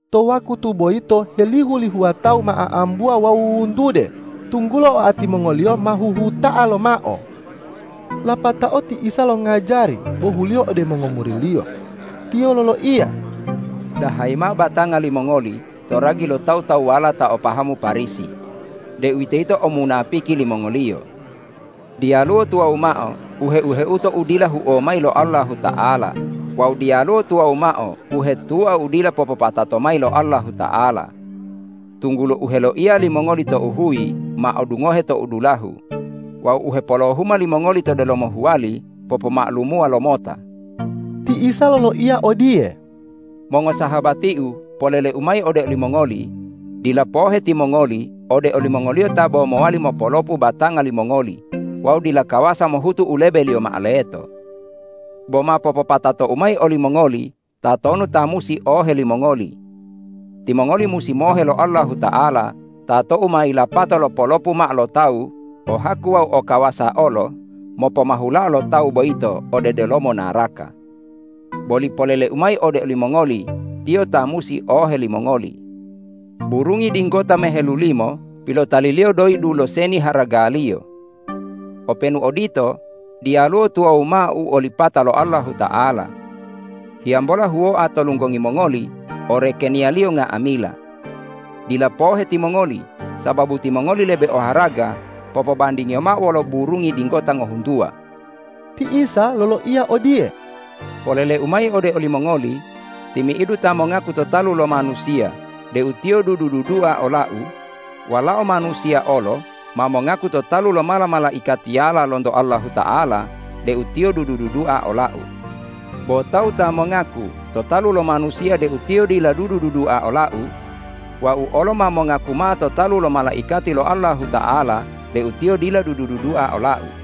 To wakutu boyito helihu-lihuwa tawu ma a'ambuwa wawu wuwuntude, tunggulo oati mongoliyo ma huhuta'a lomao. Lapatao ti Isa longajari, bohuliyo ode mongomuri-Liyo. Tiyo loloiya,”Dahayi mao batanga limongoli to ragi lo tawu-tawuwala ta o pahamu Parisi, deuwitoyito omunapiki limongoliyo. Diyaluwo tuwawu mao u heu-heuto u dila huo mayi lo Allahuta'ala wawu diyaluwo tuwawu mao u hetua u dila popopatato mayi lo Allahuta'ala, tunggulo u heloiya limongoli tou huyi ma odungohe tou dulahu wawu u hepolohuma limongoli to delomo huwali popoma'alumuwa lomota.” Ti Isa loloiya odiye,”Mongosahabati-U, polele-U mayi ode olimongoli: Dila pohe timongoli ode olimongoliyo ta bo mowali mopolopu batanga limongoli wawu dila kawasa mohutu u lebeliyo mao leto. Bo ma popopatato-U mayi olimongoli tatonu ta musi ohe limongoli. Timongoli musi mohe lo Allahuta'ala ta tou ma yilapato lopolopu mao lo tawu, o haku wawu o kawasa olo mopomahulao to tawu boyito ode delomo naraka. Boli polele-U mayi ode olimongoli: Tiyo ta musi ohe limongoli! Burungi dinggota mehelulimo pilotaliliyo doyi dulo seni haragaliyo. Openu odito, diyaluwo tuwawu mao u olipata lo Allahuta'ala. Hiyambola huwoa to lunggongi mongoli o rekeniya-Liyo nga'amila. Dila pohe timongoli, sababu timongoli lebe oharaga popobandingiyo mao wolo burungi dinggota ngohuntuwa!” Ti Isa loloiya odiye,”Polele-U mayi ode olimongoli: Timi'idu ta mongaku to talu lo manusiya deu tiyo dudu-dudua ola-U, Walao Manusiya olo ma mongaku to talu lo mala-malaikatiyala lonto Allahuta'ala deu tiyo dudu-dudua ola-U. Bo tawu ta mongaku to talu lo manusiya deu tiyo dila dudu-dudua ola-U, Wau olo ma mongaku mao to talu lo malaikati lo Allahuta'ala deu tiyo dila dudu-dudua ola-U.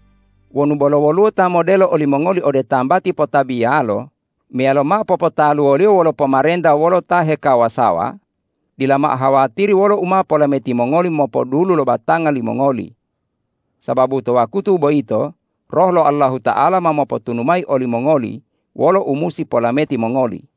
Wonu bolo woluwo ta modelo olimongoli ode tambati potabiyalo meyalo mao popotaluwoliyo wolo pomarenta wolo ta heokawasawa, dila mao hawatiri wolo u ma polameti mongoli mopodulu lo batanga limongoli. Sababu to wakutu boyito Roh lo Allahuta'ala ma mopotunu mayi olimongoli wolo u musi polameti mongoli.”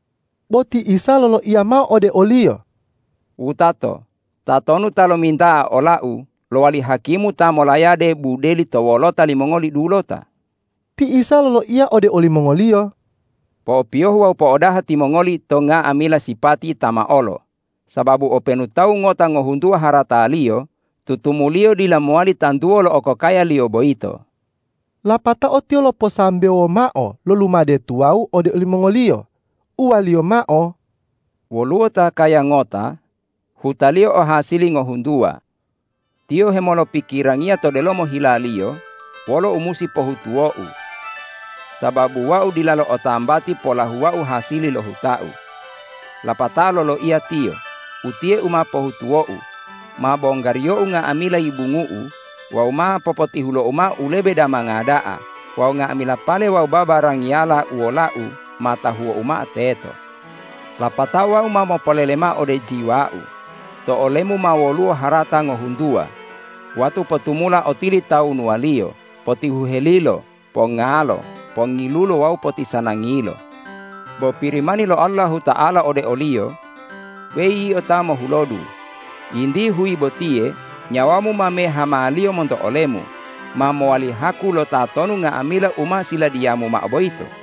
Bo ti Isa loloiya mao ode oliyo,”Wutato, tatonu ta lominta'a ola-U lowali hakimu ta molayade budeli to wolota limongoli dulota?” Ti Isa loloiya ode olimongoliyo,”Po'opiyohu wawu po'odaha timongoli to nga'amila sipati tamaolo, sababu openu tawu ngota ngohuntuwa harataliyo, tutumuliyo dila mowali tantuwo lo okokayaliyo boyito.” Lapatao Tiyo loposambewo mao lo lumade tuwawu ode olimongoli, uwa-Liyo mao,”Woluwo ta kaya ngota, hutaliyo o hasili ngohuntuwa. Tiyo hemolopikirangiya to delomo hilaliyo: Wolo u musi pohutuwou? Sababu wau dilalo o tambati polahuwau hasili lo hutau. Lapatao loloiya tiyo, ’Utiye u ma pohutuwou: Ma bonggariyou nga'amila yibungu'u wawu ma popotihulou mao u lebe damanga da'a wawu nga'amila pale wawu babarangiyala u wolau ma tahuwou mao teto. Lapatao wau ma mopolele mao ode jiwau: To olemu ma woluwo harata ngohuntuwa, watu potumula otilitawunuwaliyo; potihuhelilo, pongalo, pongilulo wawu potisanangilo!’ Bo Pirimani lo Allahuta'ala ode oliyo, ’Weyi yio ta mohulodu, yinti huyi botiye nyawamu ma mehamaliyo monto olemu, ma mowali haku lotatonu nga'amila u ma siladiyamu mao boyito?’”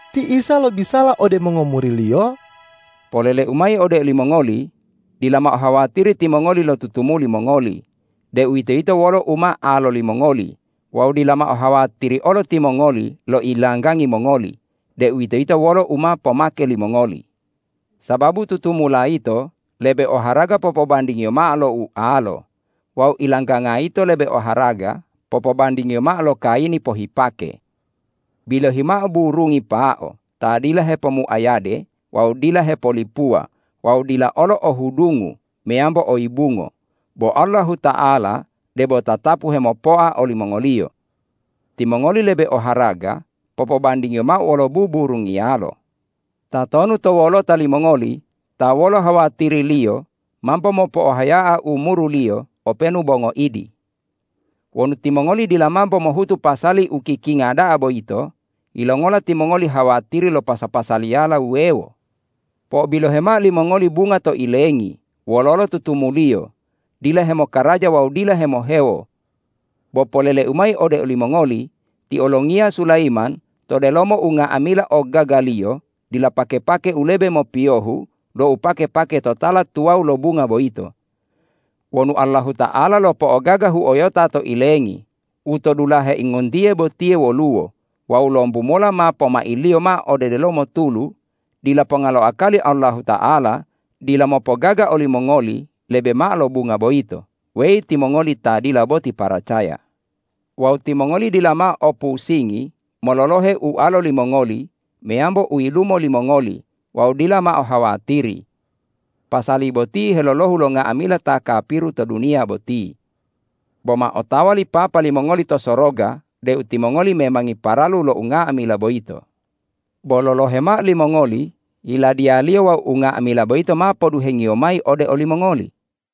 Ti Isa lobisala ode mongomuri-Liyo,”Polele-U mayi ode olimongoli: Dila mao hawatiri timongoli lo tutumuli mongoli, deuwitoyito wolo u ma alo limongoli wawu dila mao ohawatiri olo timongoli lo ilanggangi mongoli, deuwitoyito wolo u ma pomake limongoli. Sababu tutumula yito lebe oharaga popobandingiyo mao lo ualo wawu ilangganga yito lebe oharaga popobandingiyo mao lo kayini pohipake. Bilohi mao burungi pao ta dila hepomuayade wawu dila hepolipuwa wawu dila olo o hudungu meyambo o yibungo, bo Allahuta'ala debo tatapu hemopoa olimongoliyo. Timongoli lebe oharaga popobandingiyo mao wolo buburungiyalo! Tatonu to wolota limongoli ta wolo hawatiriliyo mambo mopohaya'a umuruliyo openu bo ngoidi? Wonu timongoli dila mambo mohutu pasali u kikinga da'a boyito, yilongola timongoli hawatiri lo pasa-pasaliyala wuwewo? Po'obilohe mao limongoli bunga to ilengi wololo tutumuliyo, dila hemokaraja wawu dila hemohewo. Bo polele-U mayi ode olimongoli: Ti olongiya Sulayiman to delomo unga'amila ogagaliyo dila pake-pake u lebe mopiyohu lo u pake-pake to tala tuwawu lo bunga boyito. Wonu Allahuta'ala lo po'ogaga huyo'ota to ilengi, u to dulahe ingontiye botiye woluwo wawu lombu mola ma pomailiyo mao ode delomo tulu, dila ponga lo akali Allahuta'ala dila mopogaga olimongoli lebe mao lo bunga boyito, weyi timongoli ta dila boti paracaya! Wawu timongoli dila mao opusingi mololohe ualo limongoli meyambo uyilumo limongoli wawu dila mao hawatiri. Pasali boti helolohu lo nga'amila ta kapiru to duniya boti. Bo ma otawa li Papa limongoli to soroga deu timongoli memangi paralu lo unga'amila boyito. Bo lolohe mao limongoli Yiladiya-Liyo wawu unga'amila boyito ma poduheng-Iyo mayi ode olimongoli.”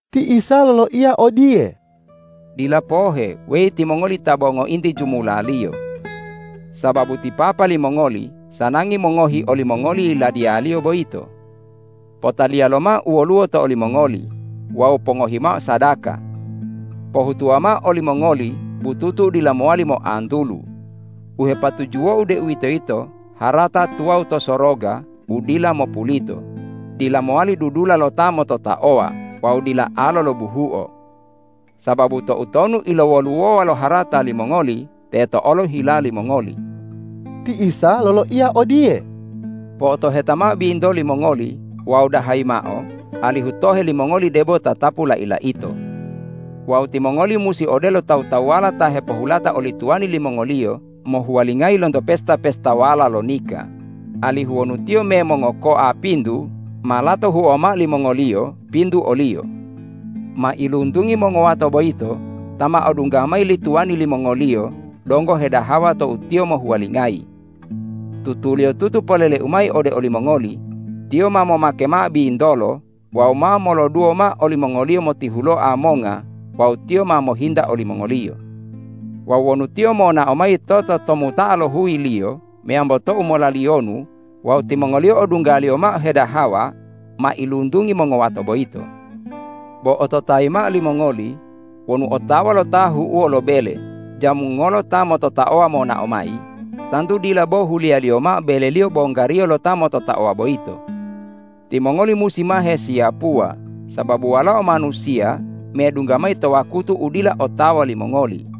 Ti Isa loloiya odiye,”Dila pohe, weyi timongoli ta bo ngointi jumulaliyo! Sababu ti Papa limongoli sanangi mongohi olimongoli Yiladiya-Liyo boyito. Potaliya lomao u woluwo to olimongoli wawu pongohi mao sadaka! Pohutuwa mao olimongoli bututu u dila mowali moantulu u hepatujuwo-U, deuwitoyito harata tuwawu to soroga u dila mopulito, dila mowali dudula lo ta mototaowa wawu dila alo lo buhuo. Sababu toutonu ilowoluwowa lo harata limongoli, teto olo hila limongoli!” Ti Isa loloiya odiye,”Po'otoheta mao bintoli mongoli wawu dahayi mao, alihu tohe limongoli debo tatapu lai-laito. Wawu timongoli musi odelo tawu-tawuwala ta hepohulata oli tuwani limongoliyo mohuwalingayi lonto pesta-pestawala lo nika, alihu wonu tiyo me mongokoa pintu, ma lato huowa mao limongoliyo pintu oliyo. Mailuntungi mongowato boyito ta ma odungga mayi li tuwani limongoliyo donggo hedahawa tou tiyo mohuwalingayi. Tutuliyotutu polele-U mayi ode olimongoli: Tiyo ma momake mao bintolo wawu ma moloduwo mao olimongoliyo motihuloa monga wawu tiyo ma mohinta olimongoliyo. Wawu wonu tiyo monao mayi to tomuta'a lo huyiliyo meyambo tou molaliyonu wawu timongoliyo odunggaliyo mao hedahawa, mailuntungi mongowato boyito. Bo ototayi mao limongoli: Wonu otawa lo tahu'uwo lo bele jam ngolo ta mototaowa monao mayi, tantu dila bo huliyaliyo mao beleliyo bonggariyo lo ta mototaoa boyito. Timongoli musi ma hesiyapuwa, sababu Walao Manusiya medungga mayi to wakutu u dila otawa limongoli.”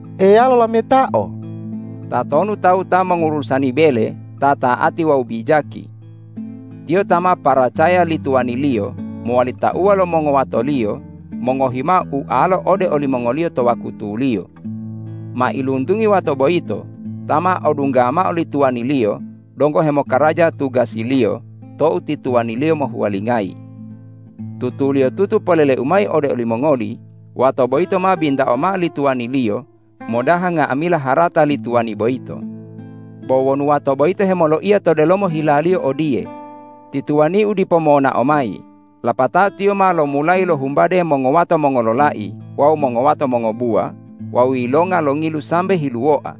Eya lolametao,”Tatonu tawu ta mongurusani bele ta ta'ati wawu bijaki? Tiyo ta ma paracaya li tuwaniliyo mowali tauwa lo mongowatoliyo mongohi mao ualo ode olimongoliyo to wakutuliyo. Mailuntungi wato boyito ta ma odungga mao li tuwaniliyo donggo hemokaraja tugasiliyo tou ti tuwaniliyo mohuwalingayi. Tutuliyotutu polele-U mayi ode olimongoli: Wato boyito ma bintao mao li tuwaniliyo modaha nga'amila harata li tuwani boyito. Bo wonu wato boyito hemoloiya to delomo hilaliyo odiye, ’Ti tuwaniu dipo monao mayi.’ Lapatao tiyo ma lomulayi lohumbade mongowato mongololai wawu mongowato mongobuwa wawu yilonga longilu sambe hiluwoa.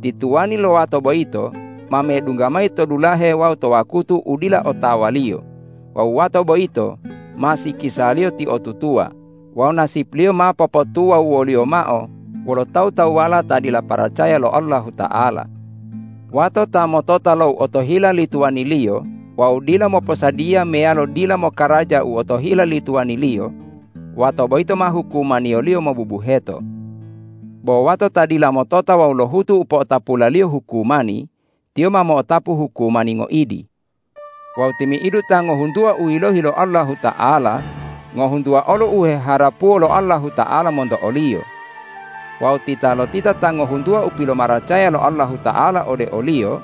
Ti tuwani lo wato boyito ma medungga mayi to dulahe wawu to wakutu u dila otawaliyo wawu wato boyito ma sikisaliyo tiotutuwa wawu nasipliyo ma popotu wawu woliyo mao wolo tawu-tawuwala ta dila paracaya lo Allahuta'ala. Wato ta motota lo u otohila li tuwaniliyo wawu dila moposadiya meyalo dila mokaraja u otohila li tuwaniliyo, wato boyito ma hukumaniyoliyo mobubuheto. Bo wato ta dila motota wawu lohutu u po'otapulaliyo hukumani, tiyo ma mo'otapu hukumani ngoidi. Wawu timi'idu ta ngohuntuwa u yilohi lo Allahuta'ala, ngohuntuwa olo u heharapuwo lo Allahuta'ala monto oliyo. Wawu titalotita ta ngohuntuwa u pilomaracaya lo Allahuta'ala ode oliyo,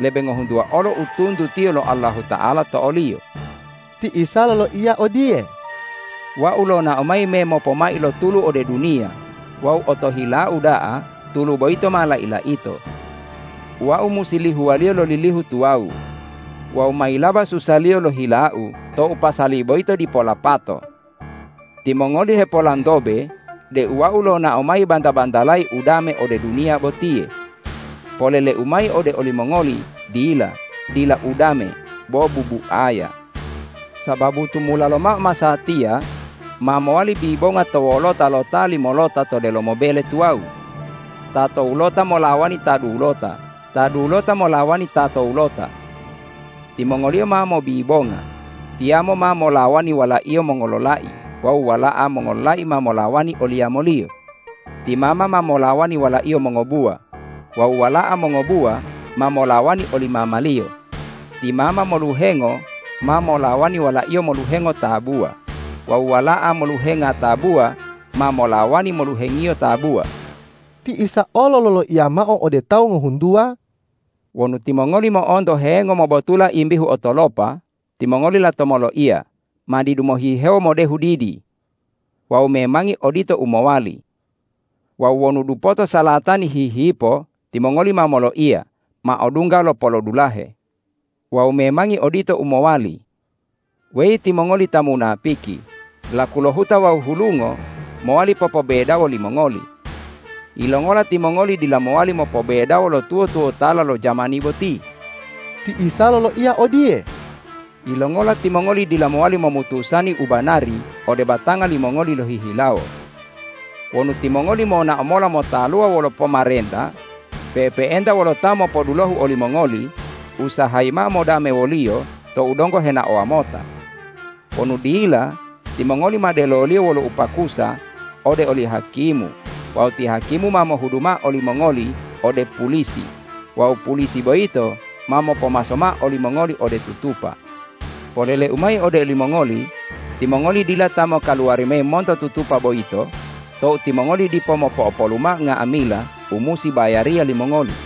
lebe ngohuntuwa olo u tuntutiyo lo Allahuta'ala to oliyo.” Ti Isa loloiya odiye,”Wau lonao mayi memopomai lo tulu ode duniya wawu otohila-U da'a tulu boyito ma lai-laito! Wau musi lihuwaliyo lo lilihu tuwawu wawu mayilaba susaliyo lo hila-U tou pasali boyito dipo lapato! Timongoli hepolantobe deu Wau lonao mayi banta-bantalayi udame ode duniya botiye. Polele-U mayi ode olimongoli: Dila! Dila udame, bo bubuaya. Sababu tumula lomao masatiya, ma mowali bibonga to wolota lo ta limolota to delomo bele tuwawu, ta towulota molawani ta dulota, ta dulota molawani ta towulota. Timongoliyo ma mobibonga: Tiyamo ma molawani walaiyo mongololai wawu wala'a mongololai ma molawani oli yamoliyo, ti mama ma molawani walaiyo mongobuwa wawu wala'a mongobuwa ma molawani oli mamaliyo, ti mama moluhengo ma molawani walaiyo moluhengo tabuwa wawu wala'a moluhenga tabuwa ma molawani moluhengiyo tabuwa.” Ti Isa olo loloiya mao ode tawu ngohuntuwa,”Wonu timongoli mo'onto hengo mobotula imbihu otolopa, timongoli lato moloiya, ’Ma didu mohihewo modehu didi.’ Wawu memangi odito u mowali. Wawu wonu dupoto salatani hihipo, timongoli ma moloiya, ’Ma odungga lo polodulahe.’ Wawu memangi odito u mowali. Weyi timongoli ta munapiki, laku lo huta wawu hulungo mowali popobedawo limongoli. Yilongola timongoli dila mowali mopobedawo lo tuwo-tuwotala lo jamani boti?” Ti Isa loloiya odiye,”Yilongola timongoli dila mowali momutusani u banari ode batanga limongoli lohihilawo? Wonu timongoli monao mola motaluwa wolo pomarenta pe'epe'enta wolo ta mopodulohu olimongoli, usahayi mao modame woliyo tou donggo henaowa mota. Wonu dila, timongoli ma deloliyo wolo upakusa ode oli hakimu wawu ti hakimu ma mohudu mao olimongoli ode pulisi wawu pulisi boyito ma mopomaso mao olimongoli ode tutupa. Polele-U mayi ode olimongoli: Timongoli dila ta mokaluwari mayi monto tutupa boyito tou timongoli dipo mopo'opolu mao nga'amila u musi bayariya limongoli.”